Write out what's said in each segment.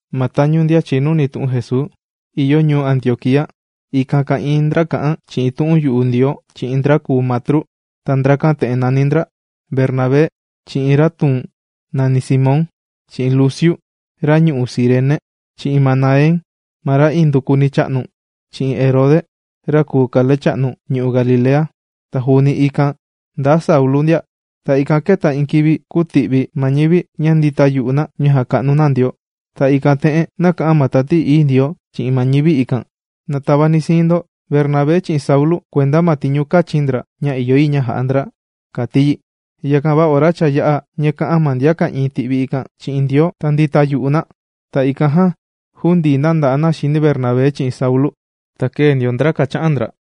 Ma tañu ndian chìnuni tu'un Jesuu ìyo ñuu Antioquía, ikan ka'ìin ndra kà'an chi'in tu'un yu'u Ndioo chi'in ndra kùu matru. Ta ndrakan te'en nàni ndra: Bernabé, chi'in ra tuun nàni Simón, chi'in Luciu ra ñu'u' Cirene, chi'in Manaén ma ra indukuni chā'nu chi'in Herode ra kùu kalecha'nu ñu'u' Galilea. Ta juuni ikan, ndaa Saulu ndia. Ta ikan kēta iin kivi kūti'vi ma ñivi ña ndìta yu'u na ña jàka'nu na Ndioo. Ta ikan te'en nāka'an ma Tati Ií Ndioo chi'in ma ñivi ikan: ―Na tavani'i siin ndo Bernabé chi'in Saulu kuenda ma tiñu kāchi̱n ndra ña ìyo yi ña ja'a ndra ―kàti yi. Yakan va ora cha yā'a ña kā'an ma ndian ka'ìin ti'vi ikan chi'in Ndioo ta ndīta yu'u na, ta ikan jan jūndii na nda'a na xini Bernabé chi'in Saulu. Ta kēe ndio ndra kàcha'an ndra.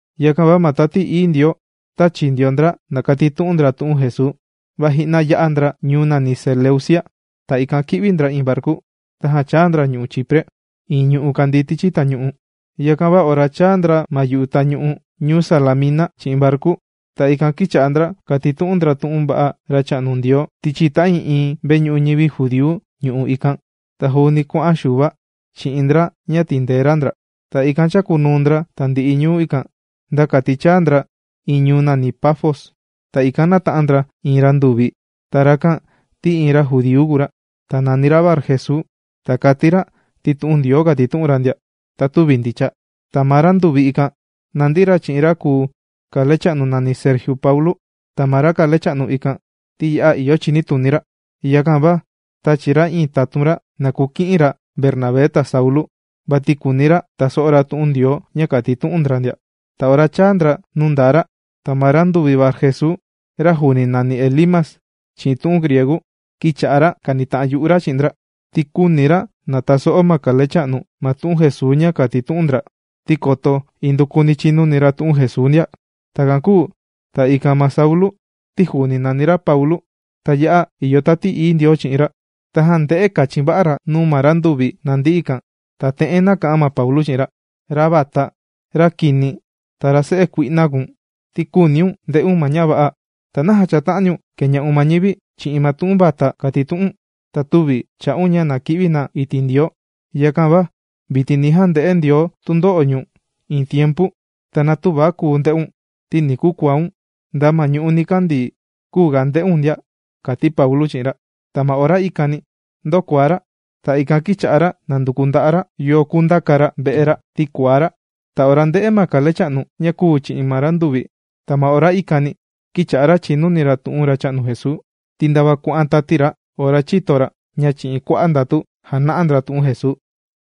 Yakan va ma Tati Ií Ndioo tāchi ndio ndra na kàtitu'un ndra tu'un Jesuu, va ji'na yā'a ndra ñuu nàni Seleucia. Ta ikan kī'vi ndra iin varku, tajan chāa ndra ñu'u' Chipre iin ñu'u' kàndii tichi tañu'u. Yakan va ora chāa ndra ma yu'u tañu'u ñuu Salamina chi'in varku, ta ikan kīcha'a ndra kàtitu'un ndra tu'un va'a Racha'nu Ndioo tichi ta'ii'iin veñu'u ñivi judíu ñu'u' ikan. Ta juuni kuà'an Xuva chi'in ndra ña tìndee ra ndra ndia. Ta ikan chākunuu ndra tandi'i ñu'u' ikan, nda kati chāa ndra iin ñuu nàni Pafos. Ta ikan nāta'an ndra iin randuvi. Ta rakan ti iin ra judíu kùu ra, ta nàni ra Barjesuu. Ta kàti ra ti tu'un Ndioo kàtitu'un ra ndia, va tüvi ndicha. Ta ma randuvi ikan nàndi ra chi'in ra kùu kalecha'nu nàni Sergiu Paulu. Ta ma ra kalecha'nu ikan, ti ya'a ìyo chinituni ra, yakan va tāchi ra iin tatun ra na kuki'in ra Bernabé ta Saulu, vati kùuni ra taso'o ra tu'un Ndioo ña kàtitu'un ndra ndia. Ta ora chāa ndra nuu ndaa ra, ta ma randuvi Barjesuu, ra juuni nàni Elimas chi'in tu'un griegu, kīcha'a ra kànita'an yu'u ra chi'in ndra ti küuni ra na taso'o ma kalecha'nu ma tu'un Jesuu ña kàtitu'un ndra, ti koto indukuni chinuni ra tu'un Jesuu ndia. Takan kūu ta ikan ma Saulu ti juuni nàni ra Paulu, ta ya'a ìyo Tati Ií Ndioo chi'in ra, tajan ndē'e kachin va'a ra nuu ma randuvi nàndi ikan. Ta te'en nāka'an ma Paulu chi'in ra: ―Ra vata, ra kini, ta ra se'e kui'na kùu̱n, ti küuniun nde'un ma ña va'a. ¿Ta naja chàta'aniun keña'un ma ñivi chi'in ma tu'un vata kàtitu'u̱n, ta tüvi chà'un ña na ki'vi na iti' Ndioo? Yakan va vitin ni jande'e Ndioo tundo'o ñu̱n iin tiempu. Ta na tüva kuu nde'un ti ni kukuaun nda ma ñu'ú nikandii küu ga nde'un ndia ―kàti Paulu chi'in ra. Ta ma ora ikani ndōkuaá ra. Ta ikan kīcha'a ra nànduku nda'a' ra yo kundaka ra ve'e ra ti kuaá ra. Ta ora ndē'e ma kalecha'nu ña kūu chi'in ma randuvi, ta ma ora ikani kīcha'a ra chìnuni ra tu'un Racha'nu Jesuu, ti ndava kuà'an tati ra ora chīto ra ña chi'in kua'a' ndatu jàna'a ndra tu'un Jesuu.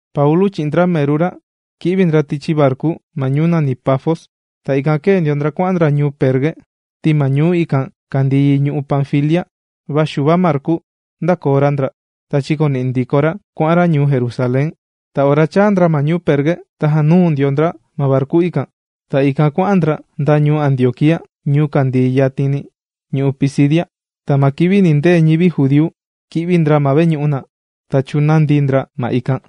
Paulu chi'in ndra meru ra kī'vi ndra tichi varku ma ñuu nàni Pafos. Ta ikan kēe ndio ndra kuà'an ndra ñuu Perge, ti ma ñuu ikan kàndii yi ñu'u' Panfilia. Va Xuva Marku ndākoo ra ndra, ta chīkoni'i ndiko ra kuà'an ra ñuu Jerusalén. Ta ora chāa ndra ma ñuu Perge, tajan nūu ndio ndra ma varku ikan. Ta ikan kuà'an ndra nda ñuu Antioquía, ñuu kàndii yatin ñu'u' Pisidia. Ta ma kivi nìndee ñivi judíu, kī'vi ndra ma veñu'u na, ta chūnandi ndra ma ikan.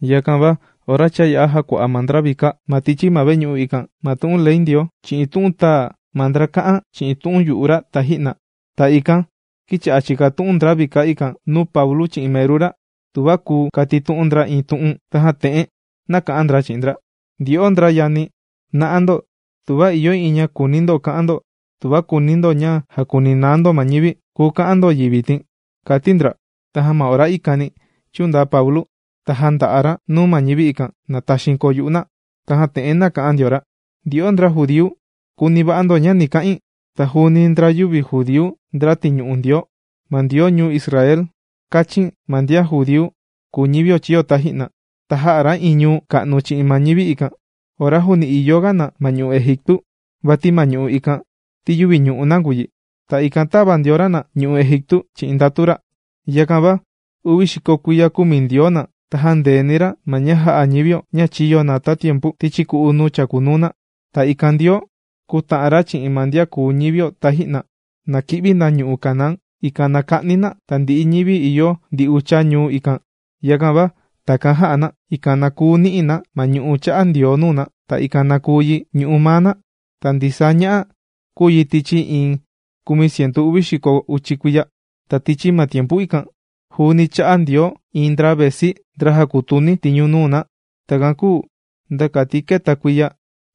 Yakan va ora cha yā'a jàkua'a ma ndra vika ma tichi ma veñu'u ikan ma tu'un Ley Ndioo chi'in tu'un tāa ma ndra kà'an chi'in tu'un yu'u ra taji'na, ta ikan kīcha'a chìkatu'un ndra vika ikan nuu Paulu chi'in meru ra tuva kuu katitu'un ndra iin tu'un. Tajan te'en nāka'an ndra chi'in ndra: ―Ndyo'o ndra yani, ¡na'a ndo tuva ìyo iin ña kùuni ndo ka'an ndo tuva kùuni ndo ña jàkuninaa ndo ma ñivi, kùu ka'an ndo yi vitin! ―kàti ndra. Tajan ma ora ikani chūndaa Paulu ta jānda'a ra nuu ma ñivi, ikan na taxiin koo yu'u na. Tajan te'en nāka'an ndio ra: ―Ndyo'o ndra judíu kuni va'a ndo ña ni ka'in. Ta juuni ndra yüvi judíu, ndra tìñu'u Ndioo. Ma Ndioo ñuu Israel, kāchin ma ndian judíu kùu ñivio chīyo taji'na. Ta jā'a ra iin ñuu ka'nu chi'in ma ñivi ikan, ora juuni ìyo ga na ma ñu'u' Egiptu. Vati ma ñu'u' ikan ti yüvi ñu'u' na kùu yi. Ta ikan tāva ndio ra na ñu'u' Egiptu chi'in ndatu ra. ’Yakan va uvi xiko kuiya kūmi Ndioo na ta jāndeeni ra ma ña jā'a ñivio ña chīyo na tatiempu tichi ku'u nuu chàkunuu na. Ta ikan Ndioo kūta'an ra chi'in ma ndian kùu ñivio taji'na, na ki'vi na ñu'u' Canaán. Ta ikan na ka'ni na tandi'i ñivi ìyo ndi ucha ñuu ikan. Yakan va, takan jā'a na, ikan na kuu ni'i na ma ñu'u' chā'a Ndioo nuu na, ta ikan na kuu yi ñu'u' maa na. Ta ndisaa ña'a kūu yi tichi iin kumi cientu uvi xiko uchi kuiya. ’Ta tichi ma tiempu ikan, juuni chā'a Ndioo iin ndra vesi, ndra jàkutuni tiñu nuu na. Takan kūu nda kati kēta kuiya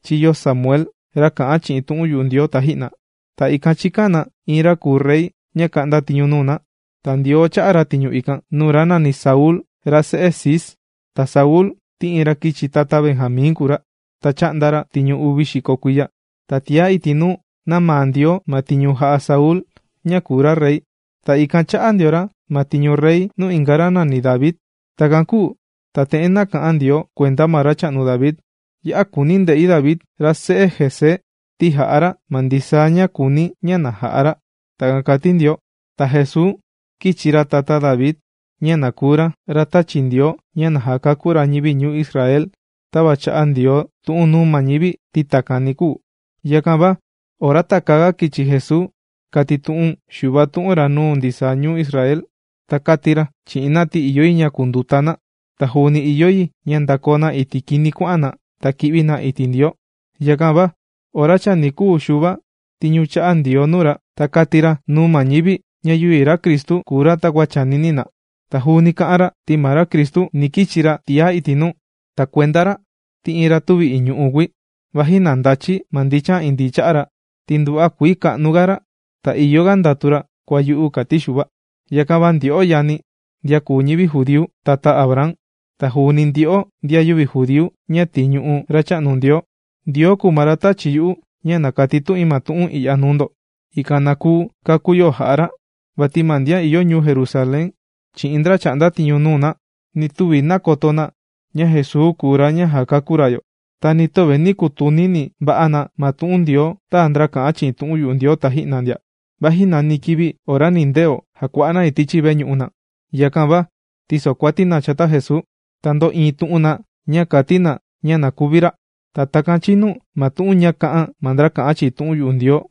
chīyo Samuel, ra kà'an chi'in tu'un yu'u Ndioo taji'na. Ta ikan chīkan na iin ra kùu rey ña ka'nda tiñu nuu na. Ta Ndioo chā'a ra tiñu ikan, nuu ra nàni Saulu ra se'e Cis. Ta Saulu ti iin ra kichi tata Benjamín kùu ra, ta chā'nda ra tiñu uvi xiko kuiya. Ta tiá iti' nuu, nāmaa Ndioo ma tiñu jà'a Saulu ña kùu ra rey. Ta ikan chā'a ndio ra ma tiñu rey nuu inga ra nàni David. Takan kūu ta te'en nāka'an Ndioo kuenda ma racha'nu David: “Ya'a kùuni̱ nde'i David ra se'e Isaí, ti jà'a ra ma ndisaa ña kùuni̱ ña na ja'a ra.” Takan kàti Ndioo. ’Ta Jesuu kīchi ra tata David ña na kuu ra ra tāchi Ndioo ña na jakakú ra ñivi ñuu Israel tava chā'a Ndioo tu'un nuu ma ñivi ti takan ni kuu. Yakan va ora takäaga kichi Jesuu, kātitu'un Xuva tu'un ra nuu ndisaa ñuu Israel. Ta kāti ra chi'in na ti ìyo yi ña kunduta na ta juuni ìyo yi ña ndakoo na iti' kini kuà'an na ta ki'vi na iti' Ndioo. Yakan va ora chani kūu Xuva tiñu ña chā'a Ndioo nuu ra, ta kāti ra nuu ma ñivi ña yüvi ra Cristu kùu ra takua chànini na. Ta juuni kā'an ra: “Ti ma ra kùu Cristu, ni kichi ra tiá iti' nuu. Ta kuenda ra, ti iin ra tüvi iñu'u kùi, vaji na ndachi̱ ma ndichan indii cha'a ra, ti nduva'a kuii ka'nu ga ra ta ìyo ga ndatu ra kua yu'u”, kāti Xuva. ’Yakan va ndyo'o yani̱, ndian kùu ñivi judíu, tata Abraham, ta juuni ndyo'o ndian yüvi judíu ña tìñu'u Racha'nu Ndioo, Ndioo kùu ma ra tāchi yu'u ña na katitu'in ma tu'un i'ya nuu ndo, ikan na kuu kakú yo jà'a ra. Vati ma ndian ìyo ñuu Jerusalén, chi'in ndra chà'nda tiñu nuu na, nī tuvi nakoto na ña Jesuu kùu ra ña jàkakú ra yo. Ta ni töve nī kutunini va'a na ma tu'un Ndioo tāa ndra kà'an chi'in tu'un yu'u Ndioo taji'na ndia, vaji nani kivi ora nindeo jàkua'a na yi tichi veñu'u na. Yakan va tīsokuati na chata Jesuu, ta ndō'iin tu'un na ña kàti na ña na kuvi ra. Ta takan chīnu ma tu'un ña kā'an ma ndra kà'an chi'in tu'un yu'u Ndioo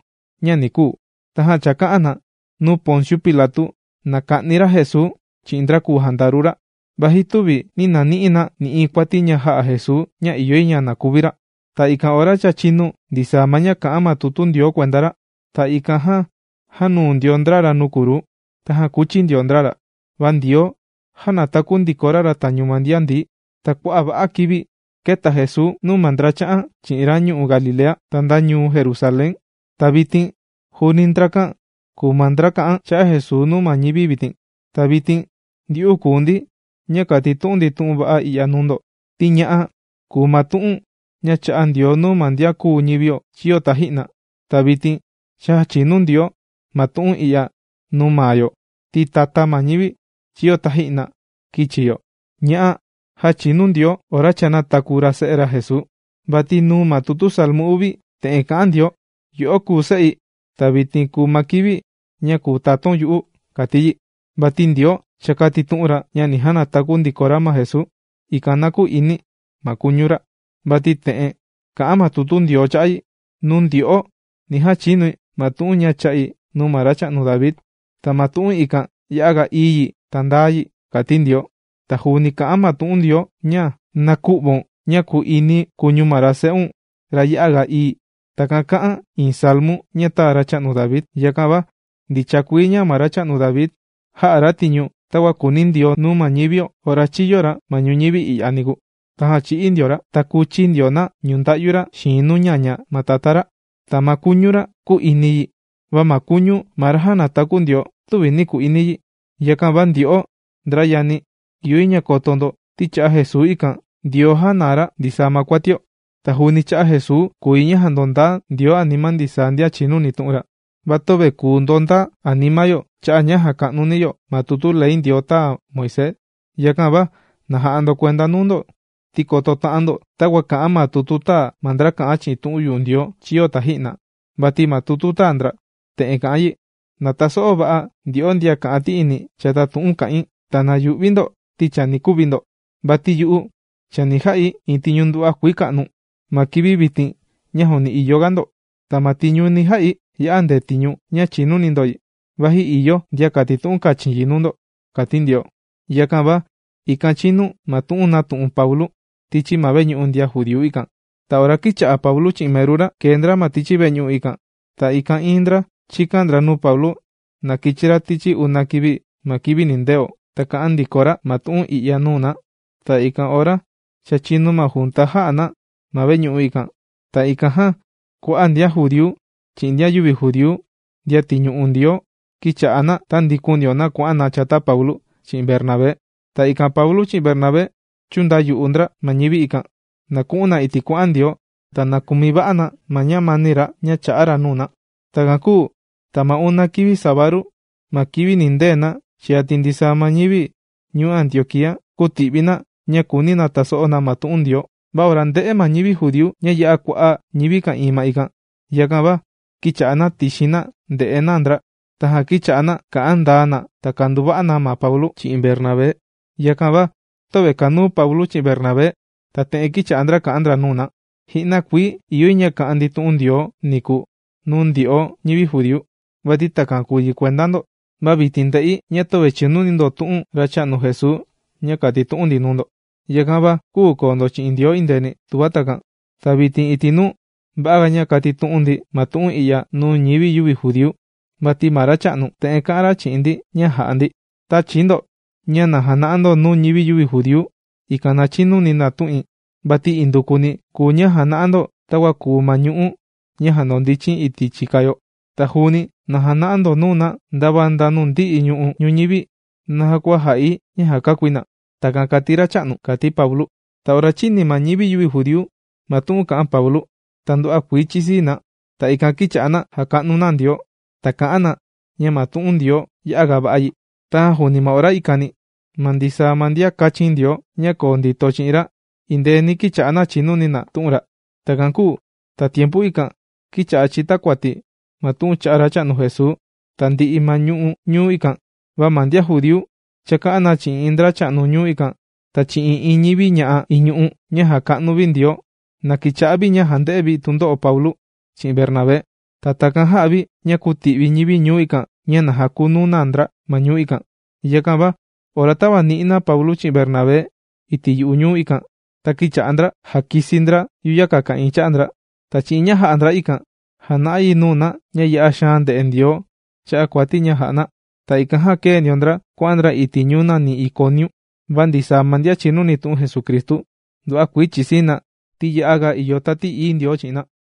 ña ni kuu. Tajan chāka'an na nuu Ponciu Pilatu na ka'ni ra Jesuu chi'in ndra kùu jandaru ra, vaji tüvi nī nani'i na nï'iin kuati ña jā'a Jesuu ña ìyo yi na kuvi ra. Ta ikan ora cha chīnu ndisaa ma ña kà'an ma tutu Ndioo kuenda ra, ta ikan jan jānuu ndio ndra ra nuu kruu, tajan kūchi ndio ndra ra. Va Ndioo jānataku ndiko ra ra tañu ndian ndií. Ta kua'a' va'a kivi kēta Jesuu nuu ma ndra chā'an chi'in ra ñu'u' Galilea, ta nda ñuu Jerusalén. Ta vitin juuni ndrakan kùu ma ndra kà'an cha'a' Jesuu nuu ma ñivi vitin. ’Ta vitin ndyu'u kùu ndi ña kàtitu'un ndi tu'un va'a i'ya nuu ndo. Ti ña'a kùu ma tu'un ña chā'a Ndioo nuu ma ndian kùu ñivio chīyo taji'na. Ta vitin cha jāchinu Ndioo ma tu'un i'ya nuu maa yo, ti tata ma ñivi chīyo taji'na kīchi yo. Ña'a jāchinu Ndioo ora cha nātaku ra Se'e ra Jesuu, vati nuu ma tutu Salmu uvi, te'en kà'an Ndioo: “Yo'o kùu se'i, ta vitin kùu ma kivi ña kùu tatáun yu'u”, kàti yi. Vati Ndioo cha kātitu'un ra ña ni janataku ndiko ra ma Jesuu, ikan na kü'ini ma kuñu ra, vati te'en kà'an ma tutu Ndioo cha'a' yi: “Nuu ndyo'o, ni jachinui ma tu'un ña chā'i nuu ma racha'nu David. Ta ma tu'un ikan ya'a ga ií yi ta ndaa yi”, kàti Ndioo. Ta juuni kà'an ma tu'un Ndioo ña: “Na kü'vaun ña ku'ini kuñu ma ra se'un ra ya'a ga ií.” Takan kā'an iin Salmu ña tāa ma racha'nu David. Yakan va ndicha kuii ña ma racha'nu David, jā'a ra tiñu takua kùuni Ndioo nuu ma ñivio ora chīyo ra ma ñuñivi i'ya niku. Tajan chī'í ndio ra, ta kūchi ndio na ñunda'yu ra xiin nuu ñaña ma tatá ra. Ta ma kuñu ra kū'ini yi. Va ma kuñu ma ra jānataku Ndioo, tüvi nī ku'ini yi. Yakan va ndyo'o ndra yani̱, ìyo yi ña koto ndo ti cha'a' Jesuu ikan, Ndioo jànaa ra ndisaa ma kuatio. Ta juuni cha'a' Jesuu kùu yi ña jàndondaa Ndioo anima ndisaa ndian chìnuni tu'un ra. Va töve kùu ndondaa anima yo cha'a' ña jàka'nu yo ma tutu Ley Ndioo tāa Moisés. Yakan va na ja'a ndo kuenda nuu ndo, ti koto ta'an ndo takua kà'an ma tutu tāa ma ndra kà'an chi'in tu'un yu'u Ndioo chīyo taji'na. Vati ma tutu tāa ndra te'en kà'an yi: Na taso'o va'a ndyo'o ndian kà'an ti'ini chata tu'un kà'in. Ta na yu'vi ndo, ti chani kuvi ndo. Vati yu'u chani ja'i iin tiñu nduva'a kuii ka'nu ma kivi vitin ña juuni ìyo ga ndo. Ta ma tiñu ni ja'i ya'a ndetiñu ña chìnuni ndo yi, vaji ìyo ndian katitu'un kàchin yi nuu ndo, kàti Ndioo. ―Yakan va ikan chīnu ma tu'un nātu'un Paulu tichi ma veñu'u ndian judíu ikan. Ta ora kīcha'a Paulu chi'in meru ra, kèe ndra ma tichi veñu'u ikan, ta ikan iin ndra chīkan ndra nuu Paulu na kichi ra tichi una kivi ma kivi nindeo, ta kà'an ndiko ra ma tu'un i'ya nuu na. Ta ikan ora cha chīnu ma junta jā'a na ma veñu'u ikan, ta ikan jan kua'a' ndian judíu chi'in ndian yüvi judíu ndian tìñu'u Ndioo, kīcha'a na tàndikun ndio na kuà'an na chata Paulu chi'in Bernabé. Ta ikan Paulu chi'in Bernabé chūndayu'u ndra ma ñivi ikan, na ku'un na iti' kuà'an Ndioo ta na kumi va'a na ma ñamani ra, ña chà'a ra nuu na. Takan kūu ta ma una kivi sabadu ma kivi nindee na cha yati ndisaa ma ñivi ñuu Antioquía kūti'vi na ña kùuni na taso'o na ma tu'un Ndioo. Va ora ndē'e ma ñivi judíu ña ya'a kua'a' ñivi ka'ìin ma ikan, yakan va kīcha'a na tixin na ndè'e na ndra. Tajan kīcha'a na kà'an ndaa na ta kànduva'a na Paulu chi'in Bernabé. Yakan va töve kànuu Paulu chi'in Bernabé, ta te'en kīcha'a ndra kà'an ndra nuu na: ―Ji'na kuii ìyo yi ña ka'an ndi tu'un Ndioo niku nuu ndyo'o ñivi judíu, vati takan kùu yi kuenda ndo. Va vitin ndè'i ña töve chìnuni ndo tu'un cha'a' Racha'nu Jesuu ña kàtitu'un ndi nuu ndo, yakan va küu koo ndo chi'in Ndioo endeeni, tuva takan. Ta vitin iti' nuu, va'aga ña kukatitu'un ndi ma tu'un i'ya nuu ñivi yüvi judíu. Vati ma Racha'nu te'en kā'an ra chi'in ndi ña jà'a ndi: Tàchi̱ ndo ña na jana'a ndo nuu ñivi yüvi judíu, ikan na chinuni na tu'in. Vati indukuni kùu ña jàna'a ndo takua kùu ma ñu'ú ña jàndondichin iti' chìka yo. Ta juuni na jana'a ndo nuu na ndava nda nuu ndi'i ñu'u' ñuñivi naja kua jà'i ña jàkakúi na. Takan kàti Racha'nu ―kàti Paulu. Ta ora chīni ma ñivi yüvi judíu ma tu'un kā'an Paulu, ta nduva'a kuii chīsii na. Ta ikan kīcha'a na jàka'nu na Ndioo ta kà'an na ña ma tu'un Ndioo ya'a ga va'a yi. Tajan juuni ma ora ikani, ma ndisaa ma ndian kāchin Ndioo ña koo ndito chi'in ra indeeni kīcha'a na chìnuni na tu'un ra. Takan kūu ta tiempu ikan kīcha'a chìtakuati ma tu'un cha'a' Racha'nu Jesuu tandi'i ma ñu'u' ñuu ikan. Va ma ndian judíu chāka'an na chi'in iin ndracha'nu ñuu ikan ta chi'in iin ñivi ña'a iñu'u ña jàka'nu vi Ndioo, na kicha'a vi ña jànde'e vi tundo'o Paulu chi'in Bernabé. Ta takan jā'a vi ña kūti'vi ñivi ñuu ikan, ña na jakunu na ndra ma ñuu ikan. Yakan va ora tāvani'i na Paulu chi'in Bernabé iti' yu'u ñuu ikan, ta kīcha'a ndra jàkisi ndra yuyaka ka'ìin cha'a ndra. Ta chi'in ña jā'a ndra ikan jàna'a yi nuu na ña ya'a xaan ndè'e Ndioo cha'a' kuati ña jà'a na. Ta ikan jan kēe ndio ndra kuà'an ndra iti' ñuu nàni Iconiu. Va ndisaa ma ndian chìnuni tu'un Jesucristu nduva'a kuii chìsii na, ti ya'a ga ìyo Tati Ií Ndioo chi'in na.